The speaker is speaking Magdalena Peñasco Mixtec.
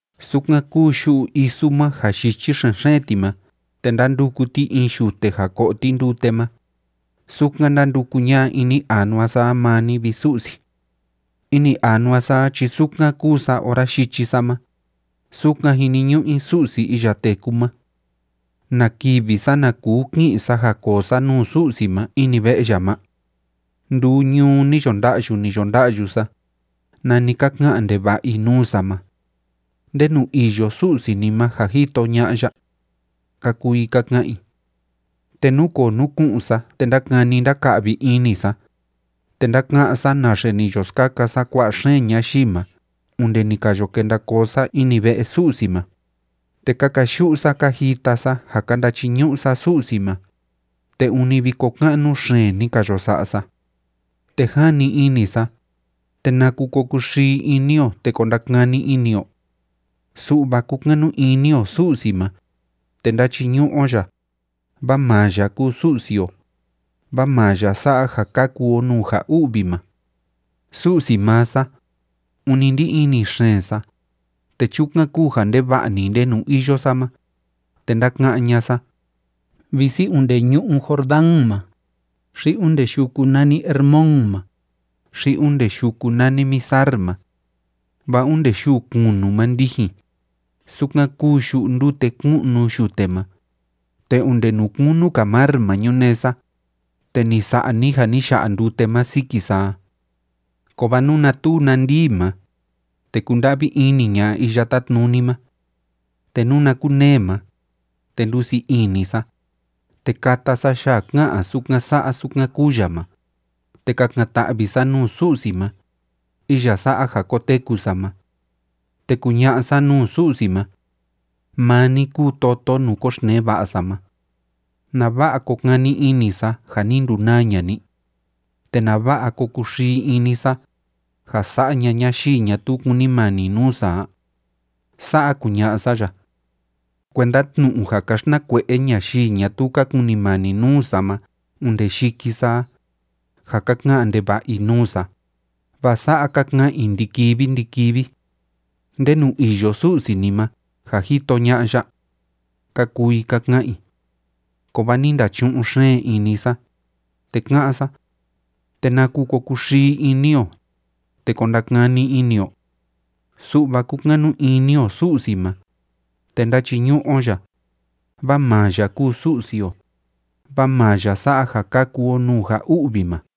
Sukan kúu yu'u isu ma, ja yichi xen‑xeen ti ma te ndánduku ti in yute ja ko'o ti ndute ma, sukan ndánduku ña'a ini anua sa a maa ni, vi Su'si. Ini anua sa a chi sukan kúu sa ora yichi sa ma, sukan jiniñu'u i Su'si iya téku ma. ¿Na kivi sana kuu ki'in sa ja koo sa nuu Su'si ma ini ve'e ya ma? Nduu ñuu ni yo nda'yu, ni yo nda'yu sa, nani ka ka'an ndeva'a i nuu sa ma: “¿Ndenu iyo Su'si ni ma, ja jito ña'a ya?”, ka kuu i ka ka'an i. Te núkoo núku'un sa, te ndákani ndáka'vi ini sa, te ndáka'án sa naxe ni yo skaka sa kua'a xeen ñayii ma onde ni ka yo kenda koo sa ini ve'e Su'si ma, te ka kayu'u sa ka jita sa ja ka ndachiñu'u sa Su'si ma, te ûni viko ka'nu xeen ni ka yo sa'a sa. Te jani ini sa, ¿te naku ko kuxii ini o, te ko ndakani ini o? Su'va kúkanu ini o Su'si ma, te ndáchiñu'u o ya, vaa maa ya kúu Su'si o, vaa maa ya sa'a ja kaku o nuu ja u'vi ma. Su'si maa sa, ûni ndí ini xeen sa, te chukan kúu ja ndeva'a‑ni ndenu iyo sa ma, te ndáka'án ña'a sa, visi onde ñu'ú Jordán ma, xi onde yuku nani Hermón ma, xi onde yuku nani Mizar ma. Vaa onde yuu kunu ma ndijin, sukan kúu yu'u ndute kú'nu yute ma, te onde nuu kunu‑ka mar ma ñunee sa, te ni sa'a ni ja ni ya'a ndute ma siki sa a. Kovaa nuna tuu na ndii ma, te kunda'vi ini ña'a Iya Tátnuni ma. Te nuna kunee ma, te ndusii ini sa, te kata sa yaa ká'an sukan sa'a sukan kúu ya ma, te kakan‑ta'vi sa nuu Su'si sa ma, iya sa'a ja koteku sa ma. Te kuña'a sa nuu Su'si ma: “Maa ni kúu toto nuu koxtnee va'a sa ma. ¿Nava'a ko kani ini sa ja ni ndunaa ña'a ni? ¿Te nava'a ko kuxii ini sa, ja sa'a ña'a ñayii ñatuu kúnimani nuu sa a?” Sa'a kuña'a sa ya. Kuenda tnu'u ja ka xtnakue'e ñayii ñatuu ka kunimani nuu sa ma onde yiki sa a, ja ka ka'an ndeva'a i nuu sa, vaa sa'a ka ka'an i ndi‑kivi ndi‑kivi: “¿Ndenu iyo Su'si ni ma, ja jito ña'a ya?”, ka kuu i ka ka'an i. Kovaa ni ndachu'un xeen ini sa, te ka'án sa: ¿Te naku ko kuxii ini o, te ko ndakani ini o? Su'va kúkanu ini o Su'si ma, te ndáchiñu'u o ya, vaa maa ya kúu Su'si o, vaa maa ya sa'a ja kaku o nuu ja u'vi ma.